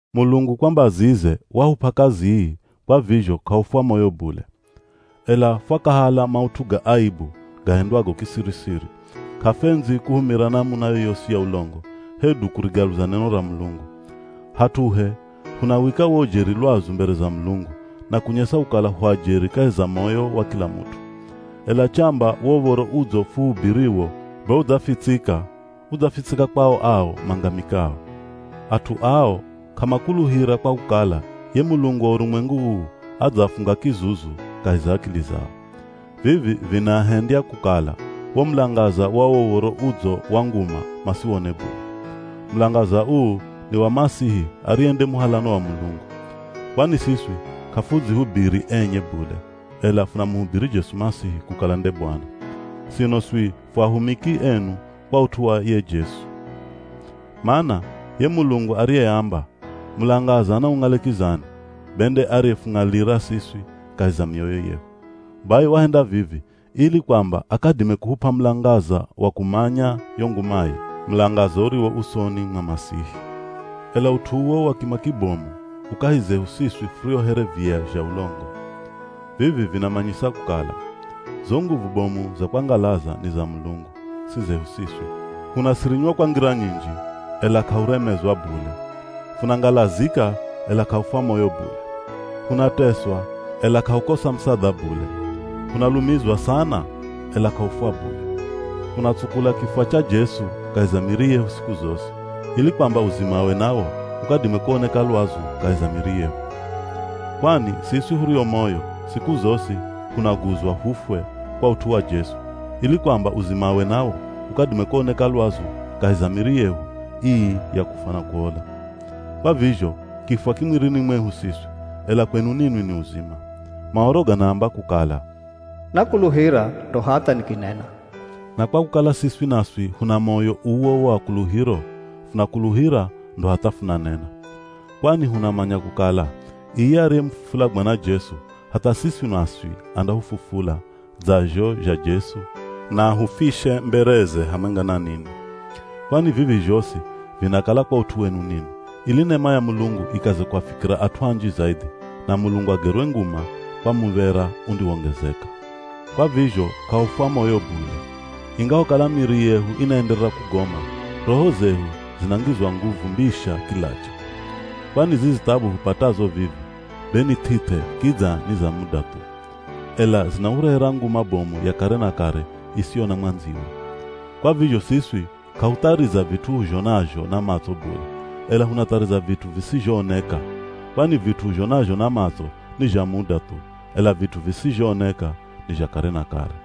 Mulungu kwa mbazize wahup'a kazi ii kwa vizho k'ahufwa moyo bule. Ela fwakahala maut'u ga aibu gahendwago kisiri-siri. K'afwendzi kuhumira namuna yoyosi ya ulongo hedu kurigaluza neno ra Mulungu. Hat'uhe, hunawika wo ujeri lwazu mbere za Mulungu, na kunyesa kukala hu ajeri kahi za moyo wa kila mut'u. Ela chamba wo Uv̱oro Udzo fuhubiriwo be udzafitsika, udzafitsika kwao ao mangamikao. At'u ao k'amakuluhira kwa kukala ye mulungu wa urumwengu uu adzaafunga kizuzu kahi za akili zao. Vivi vinaahendya kukala wo mulangaza wa wo Uv̱oro Udzo wa nguma masiwone bule. Mulangaza uu ni wa Masihi ariye nde muhalano wa Mulungu. Kwani siswi k'afudzihubiri enye bule ela funamuhubiri Jesu Masihi kukala nde Bwana. Sino swi fu ahumiki enu kwa ut'u wa ye Jesu. Mana ye Mulungu ariyeamba, “Mulangaza naung'ale kizani,” be nde ariyefung'alira siswi kahi za mioyo yehu. Bai wahenda vivi ili kwamba akadime kuhup'a mulangaza wa kumanya yo ngumaye, mulangaza uriwo usoni mwa Masihi. Ela ut'u uwo wa kima kibomu u kahi zehu siswi furio here viya zha ulongo. Vivi vinamanyisa kukala, zo nguvu bomu za kwangalaza ni za Mulungu, si zehu siswi. Hunasirinywa kwa ngira nyinji, ela k'ahuremezwa bule. Funangalazika ela k'ahufwa moyo bule. Hunateswa, ela k'ahukosa musadha bule. Hunalumizwa sana ela k'ahufwa bule. Funatsukula kifwa cha Jesu kahi za miri yehu siku zosi, ili kwamba uzimawe nawo ukadime kuoneka lwazu kahi za miri yehu. Kwani siswi hurio moyo, siku zosi hunaguzwa hufwe kwa ut'u wa Jesu, ili kwamba uzimawe nawo ukadime kuoneka lwazu kahi za miri yehu ii ya kufwa na kuola. Kwa vizho kifwa ki mwirini mwehu siswi, ela kwenu ninwi ni uzima. Maoro ganaamba kukala, “Nakuluhira ndo hatha nikinena.” Na kwa kukala siswi naswi huna moyo uwo wa kuluhiro, funakuluhira ndo hatha funanena. Kwani hunamanya kukala iye ariyemufufula Bwana Jesu, hatha siswi naswi andahufufula dza zho zha Jesu na ahufishe mbereze hamwenga na ninwi. Kwani vivi zhosi vinakala kwa ut'u wenu ninwi, ili nema ya Mulungu ikaze kuafikira at'u anji zaidhi, na Mulungu agerwe nguma kwa muv̱era undiwongezeka. Kwa vizho k'ahufwa moyo bule. Ingahokala miri yehu inaenderera kugoma, roho zehu zinangizwa nguvu mbisha kilacha. Kwani zizi thabu hupatazo vivi, be ni th'ith'e kidza ni za muda thu. Ela zinahurehera nguma bomu ya kare na kare isiyo na mwandziwe. Kwa vizho siswi k'ahuthariza vit'u huzhonazho na matso bule, ela hunathariza vit'u visizhooneka. Kwani vit'u huzhonazho na matso ni zha muda thu, ela vit'u visizhooneka ni zha kare na kare.